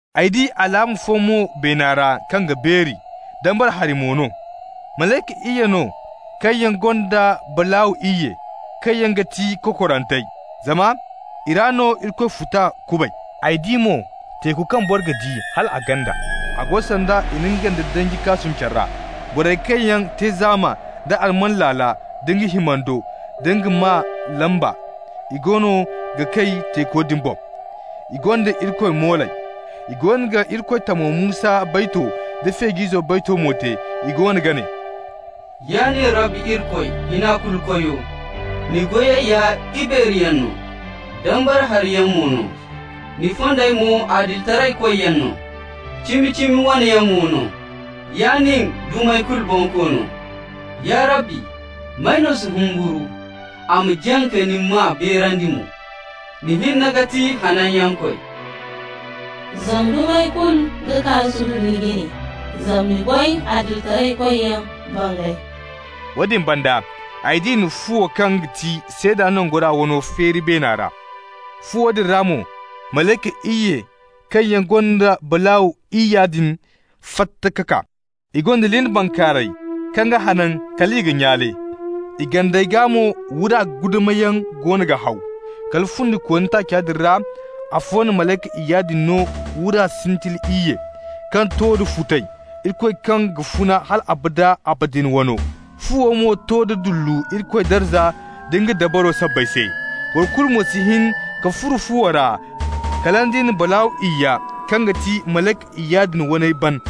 Ay di alaama fo mo beena ra kaŋ ga beeri, dambara hari mo no: malayka iyye no kaŋ yaŋ gonda balaaw iyye, kaŋ yaŋ ga ti kokorantey, zama i ra no Irikoy futa kubay. Ay di mo teeku kaŋ boro ga di hal a ganda, a go sanda i na nga nda danji kaasum care ra. Borey kaŋ yaŋ te zaama nda alman laala nda nga himando, da nga maa lamba, i goono ga kay teeko din boŋ. I gonda Irikoy mooley. I goono ga Irikoy tamo Musa bayto da Feej'izo bayto mo te. I goono ga ne: «Ya nin Rabbi Irikoy, Hina-Kulu-Koyo, ni goyey ya ibeeriyaŋ no, dambara hariyaŋ mo no. Ni fondey mo adilitaraykoyyaŋ no, cimi-cimi wane yaŋ mo no, ya nin dumey kulu Bonkoono. Ya Rabbi, may no si humburu, a ma jaŋ ka ni maa beerandi mo? Ni hinne ga ti Hananyankoy, zama dumey kulu ga kaa ka sududu ni jine, zama ni goy adilitaraykoyyaŋ bangay.» Woodin banda ay di i na fuwo, kaŋ ga ti seeda nangora wano, feeri beena ra. Fuwo din ra mo malayka iyye kaŋ yaŋ gonda balaaw iyya din fatta ka kaa. I gonda lin bankaaray kaŋ ga hanan kal i ga nyaale. I gandey gaa mo wura guddamayaŋ goono ga haw. Kala fundikooni taaca din ra afo na malayka iyya din no wura sintili iyye, kaŋ to da futay, Irikoy kaŋ ga funa hal abada abadin wano. Fuwo mo to da dullu Irikoy darza nd'a dabaro sabbay se. Boro kulu mo si hin ka furo fuwo ra kala nd'i na balaaw iyya, kaŋ ga ti malayka iyya din waney, ban.